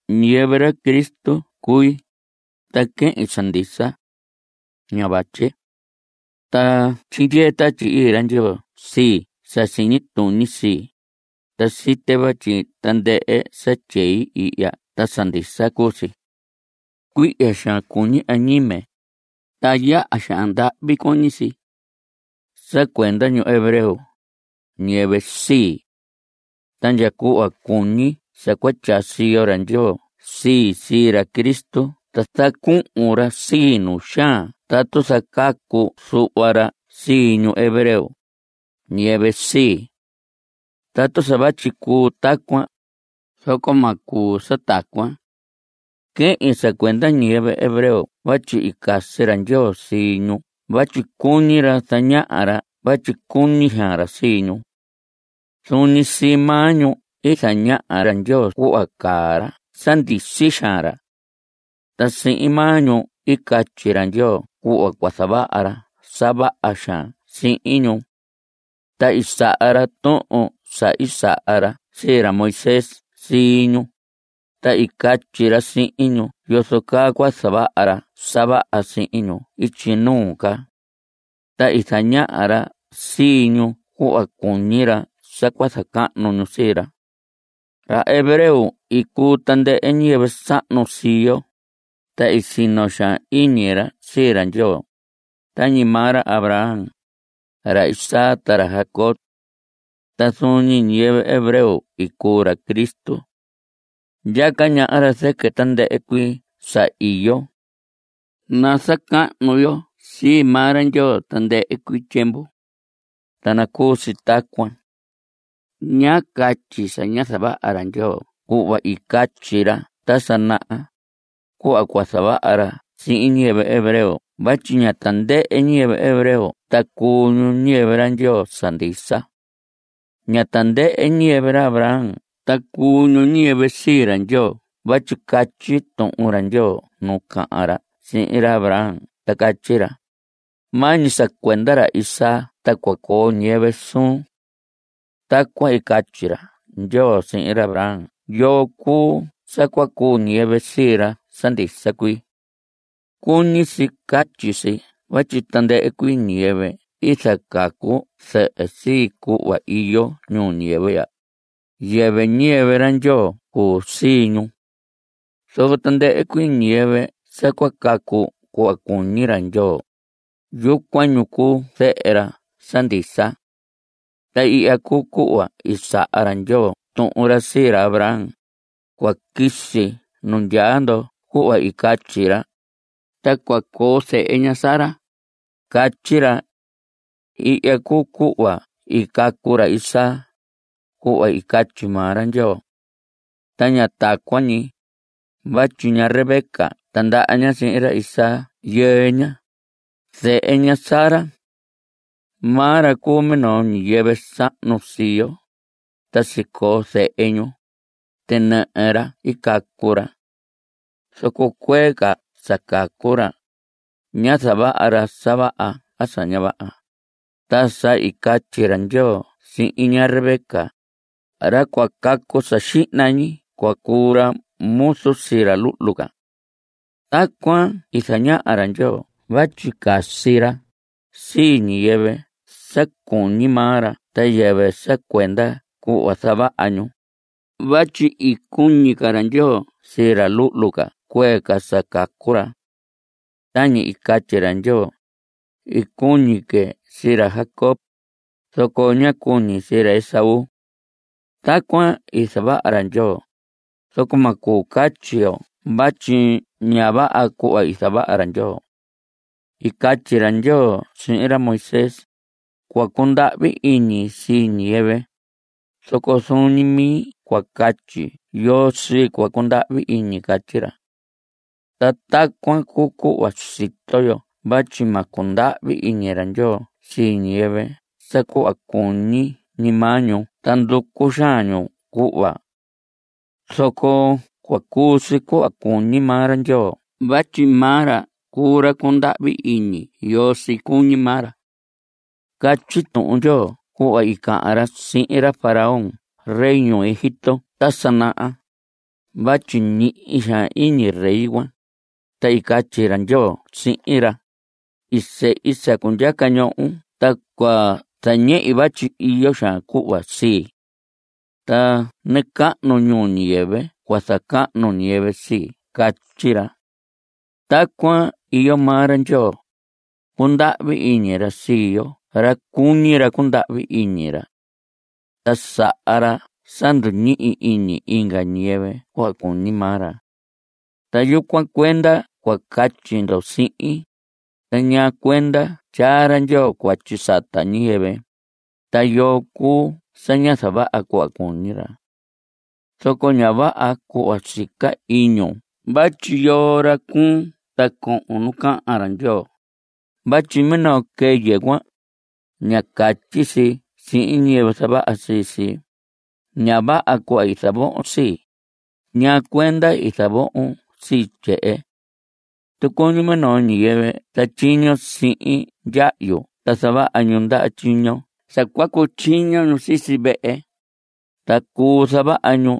Ñiyɨvɨ ra Cristo cui, ta quehin sa ndisa. Ña vatye. Ta tyindyee Tatyi Ii ra Ndyoo sii sa siñi tuñi sii, ta site vatyi (tandɨhɨ sa tyei ihya ta) sa ndisa cuu si. Cuihya xaan cuñi añime. Ta yaha xaan ndahvi cuñi si. (Sa cuenda ñu hebreo, ñiyɨvɨ sii.) Ta ndya cuhva cuñi sa cua tyaa siyo ra Ndyoo sii, sii ra Cristo ta zacuhun ra sii nu xaan tatu zacacu zuhva ra sii ñu hebreo, ñiyɨvɨ sii. Tatu sa vatyi cuu tacuan, zoco ma cuu sa tacuan. Quehin sa cuenda ñiyɨvɨ hebreo vatyi i casi ra Ndyoo sii ñu vatyi cuñi ra zañaha ra vatyi cuñi xaan ra sii ñu. Zuun ñi sii maa ñu i zañaha ra Ndyoo cuhva caa ra sa ndisi xaan ra. Ta sihin maa ñu i catyi ra Ndyoo cuhva cua zavaha ra sa vaha xaan sihin ñu. Ta i saha ra tuhun sa i saha ra sii ra Moisés sii ñu, ta i catyi ra sihin ñu yozo caa cua zavaha ra sa vaha sihin ñu ityi nuu ca. Ta i zañaha ra sii ñu cuhva cuñi ra sa cua zacahnu ñu sii ra. Ra hebreo i cuu tandɨhɨ ñiyɨvɨ sahnu sii yo, ta i sino xaan iñi ra sii ra Ndyoo (tañi maa ra Abraham, ra Isaac, ta ra Jacob). Ta zuun ñi ñiyɨvɨ hebreo cuu ra Cristo. Ndyaca ñaha ra zɨquɨ tandɨhɨ cuii sa iyo. Nazacahnu yo sii maa ra Ndyoo tandɨhɨ cuii tyiemvu. Ta nacuu si tacuan. Ña catyi sa ñá zavaha ra Ndyoo cuhva i catyi ra ta sa naha, cuhva cua zavaha ra sihin ñiyɨvɨ hebreo vatyi ña tandɨhɨ ñiyɨvɨ hebreo ta cuu ñu ñiyɨvɨ ra Ndyoo sa ndisa. Ña tandɨhɨ ñiyɨvɨ ra Abraham ta cuu ñu ñiyɨvɨ sii ra Ndyoo vatyi catyi Tuhun ra Ndyoo nu cahan ra sihin ra Abraham ta catyi ra: “Maa ñi sa cuenda ra Isaac ta cua coo ñiyɨvɨ suun.” (Tacuan i catyi ra Ndyoo sihin ra Abraham yoo cuu sa cua cuu ñiyɨvɨ sii ra sa ndisa cuii.) Cuñi si catyi si vatyi tandɨhɨ cuii ñiyɨvɨ i zacacu zɨhɨ sii cuhva iyo ñuu ñiyɨvɨ ya, yɨvɨ ñiyɨvɨ ra Ndyoo cuu sii ñu. Zoco tandɨhɨ cuii ñiyɨvɨ sa cua càcù cuhva cuñi ra Ndyoo, yucuan ñu cuu zehe ra sa ndisa cuii. Ta ihya cuu cuhva i saha ra Ndyoo tuhun ra sii ra Abraham: “Cua quisi nu ndyaa ndo cuhva i catyi, ta cua coo zehe ña Sara”, catyi ra. (Ihya cuu cuhva i cacu ra Isaac, cuhva i catyi maa ra Ndyoo.) Ta ña tacuan ñi, vatyi ña Rebeca tindaha ña sihin ra Isaac yɨɨ ña, zehe ña Sara. Maa ra cuu minoo ñiyɨvɨ sahnu sii yo. Ta sicoo zehe ñu. (Tinɨhɨ ra i cacu ra.) Zoco cuee ca sa cacu ra, ñá zavaha ra sa vaha a sa ña vaha, ta sa i catyi ra Ndyoo sihin ña Rebeca: “Ra cua cacu sa xihna ñi cua cuu ra muzu sii ra luhlu ca.” Tacuan i zañaha ra Ndyoo vatyi casi ra sii ñiyɨvɨ sa cuñi maa ra ta yɨvɨ sa cuenda cuhva zavaha ñu (vatyi i cuñi ca ra Ndyoo sii ra luhlu ca cuee ca sa cacu ra). Tañi i catyi ra Ndyoo: “I cuñi que sii ra Jacob, zoco ñá cuñi sii ra Esaú.” Tacuan i zavaha ra Ndyoo, zoco ma cuu catyi yo vatyi ña vaha cuhva zavaha ra. I catyi ra Ndyoo sihin ra Moisés: “Cua cundahvi iñi sii ñiyɨvɨ, zoco zuun ñi mi cua catyi yoo sii cua cundahvi iñi.” Catyi ra. Ta tacuan cuu cuhva sito yo vatyi ma cundahvi iñi ra Ndyoo sii ñiyɨvɨ sa cuhva cuñi ñi maa ñu ta nducu xaan ñu cuhva. Zoco cua cuu si cuhva cuñi maa ra Ndyoo vatyi maa ra cuu ra cundahvi iñi yoo sii cuñi maa ra. Catyi Tuhun Ndyoo cuhva i cahan ra sihin ra Faraón rey ñuu Egipto ta sa naha. (Vatyi ñihi xaan iñi rey cuan), ta i catyi ra Ndyoo sihin ra: “I sehi sa cundyaca ñohon ta cua zañehi vatyi iyo xaan cuhva sii. Ta nacahnu ñuu ñiyɨvɨ cua zacahnu ñiyɨvɨ sii.” Catyi ra. Tacuan iyo maa ra Ndyoo. Cundahvi iñi ra sii yoo ra cuñi ra cundahvi iñi ra. Ta saha ra sa nduñihi iñi inga ñiyɨvɨ cuhva cuñi maa ra. Ta yucuan cuenda cua catyi ndo sihin: “¿Ta ñaa cuenda tyaa ra Ndyoo cuatyi sata ñiyɨvɨ? ¿Ta yoo cuu sa ña zavaha cuhva cuñi ra?” Zoco ña vaha cuhva sica iñun vatyi ¿yoo ra cuun ta cohon nu cahan ra Ndyoo? Vatyi minoo quɨyɨ cuan, ña catyi si sihin ñiyɨvɨ i zavaha sii si: “Ña vaha cuhva i zavohon sii. ¿Ñaa cuenda i zavohon sii tyehen?” Tucuñun minoo ñiyɨvɨ zatyiño sihin ndyahyu ta zavaha ñu ndaha tyiño sa cua cutyiño ñu sisi vehe, ta cuu zavaha ñu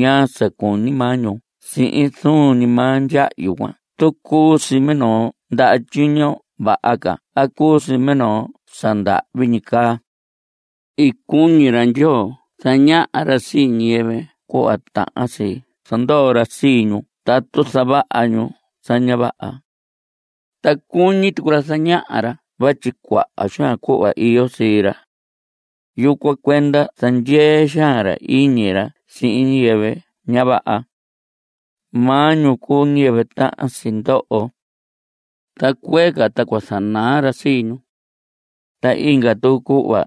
ñaa sa cuñi maa ñu sihin zuun ñi maa ndyahyu cuan tu cuu si minoo ndaha tyiño vaha ca a cuu si minoo sa ndahvi ñi caa. I cuñi ra Ndyoo zañaha ra sii ñiyɨvɨ cuhva tahan si zandoho ra sii ñu tatu zavaha ñu sa ña vaha. Ta cuñi tucu ra zañaha ra vatyi cuaha xaan cuhva iyo sii ra. Yucuan cuenda zandyee xaan ra iñi ra sihin ñiyɨvɨ ña vaha. Maa ñu cuu ñiyɨvɨ tahan si ndoho. Ta cuéé ca ta cua zanaa ra sii ñu. Ta inga tucu cuhva.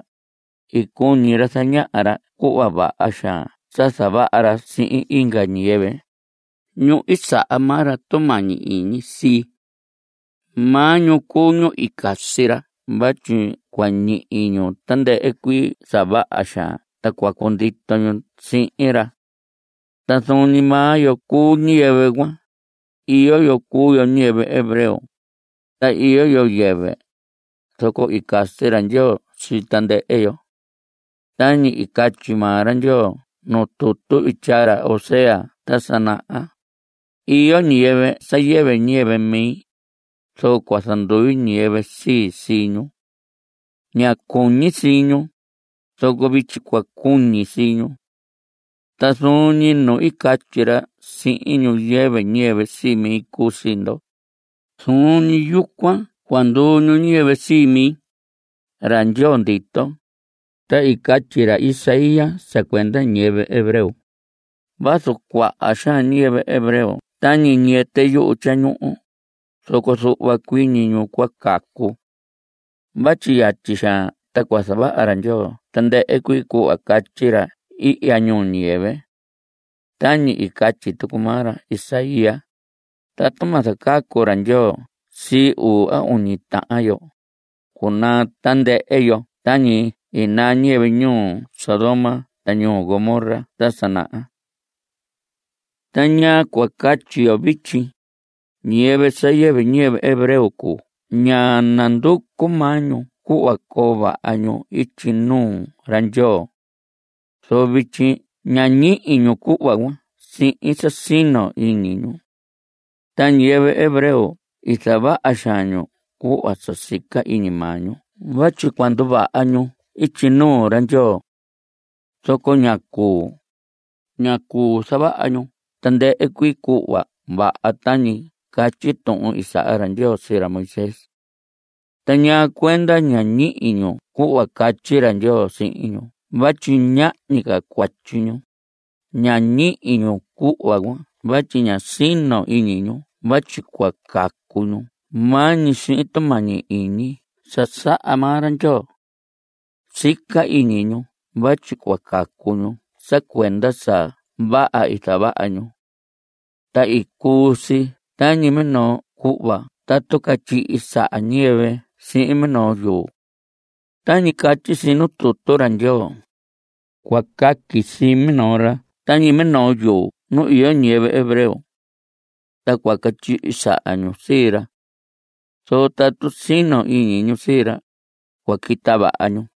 I cuñi ra zañaha ra cuhva vaha xaan sa zavaha ra sihin inga ñiyɨvɨ, ñu i saha maa ra tumañi iñi sii. Maa ñu cuu ñu i casi ra vatyi cua ñihi ñu tandɨhɨ cuii sa vaha xaan ta cua cundito ñu sihin ra. Ta zuun ñi maa yo cuu ñiyɨvɨ cuan. Iyo yo cuu yo ñiyɨvɨ hebreo. Ta iyo yo yɨvɨ. Zoco i casi ra Ndyoo sii tandɨhɨ yo. Tañi i catyi maa ra Ndyoo nuu tutu i tyaa ra Oseas ta sa naha: Iyo ñiyɨvɨ sa yɨvɨ ñiyɨvɨ mi, zoco cua zandui ñiyɨvɨ sii sii ñu. Ñá cuñi sii ñu, zoco vityi cua cuñi sii ñu. Ta zuun ñi nu i catyi sihin ñu: “Yɨvɨ ñiyɨvɨ sii mi cuu sii ndo”, zuun ñi yucuan cua nduu ñu ñiyɨvɨ sii mi, ra Ndyoo ndito. Ta i catyi ra Isaías sa cuenda ñiyɨvɨ hebreo: “Vazu cuaha xaan ñiyɨvɨ hebreo tañi ñiyɨtɨ yuhu tyañuhu, zoco zuhva cuii ñi ñu cua cacu. Vatyi yatyi xaan ta cua zavaha ra Ndyoo tandɨhɨ cuii cuhva catyi ra ihya ñuu ñiyɨvɨ.” Tañi i catyi tucu maa ra Isaías: Tatu ma zacacu ra Ndyoo sii uu a uñi tahan yo, cunaa tandɨhɨ yo Tañi i naa ñiyɨvɨ ñuu Sodoma ta ñuu Gomorra ta sa naha. ¿Ta ñaa cua catyi yo vityi? Ñiyɨvɨ sa yɨvɨ ñiyɨvɨ hebreo cuu ñá nanducu maa ñu cuhva coo vaha ñu ityi nuu ra Ndyoo. Zoco vityi nañihi ñu cuhva cuan sihin sa sino ñi iñi ñu. Ta ñiyɨvɨ hebreo i zavaha xaan ñu cuhva sa sica iñi maa ñu vatyi cua nduvaha ñu ityi nuu ra Ndyoo. Zoco ñá cuu. Ñá cuu zavaha ñu tandɨhɨ cuii cuhva vaha tañi catyi tuhun i saha ra Ndyoo sii ra Moisés. ¿Ta ñaa cuenda ñá ñihi ñu cuhva catyi ra Ndyoo sihin ñu vatyi ñahñi ca cuatyi ñu? Ñá ñihi ñu cuhva cuan vatyi ñá sino iñi ñu vatyi cua càcù ñu maa ñi sihin tumañi iñi sa saha maa ra Ndyoo. Sica iñi ñu vatyi cua càcù ñu sa cuenda sa vaha i zavaha ñu. Ta i cuu si tañi minoo cuhva tatu catyihi saha ñiyɨvɨ sihin minoo yuu. Tañi catyi si nuu tutu ra Ndyoo: Cua caqui sii minoo ra tañi minoo yuu nu iyo ñiyɨvɨ hebreo. Ta cua catyihi saha ñu sii ra. Zoco tatu sino iñi ñu sii ra, cua quita vaha ñu.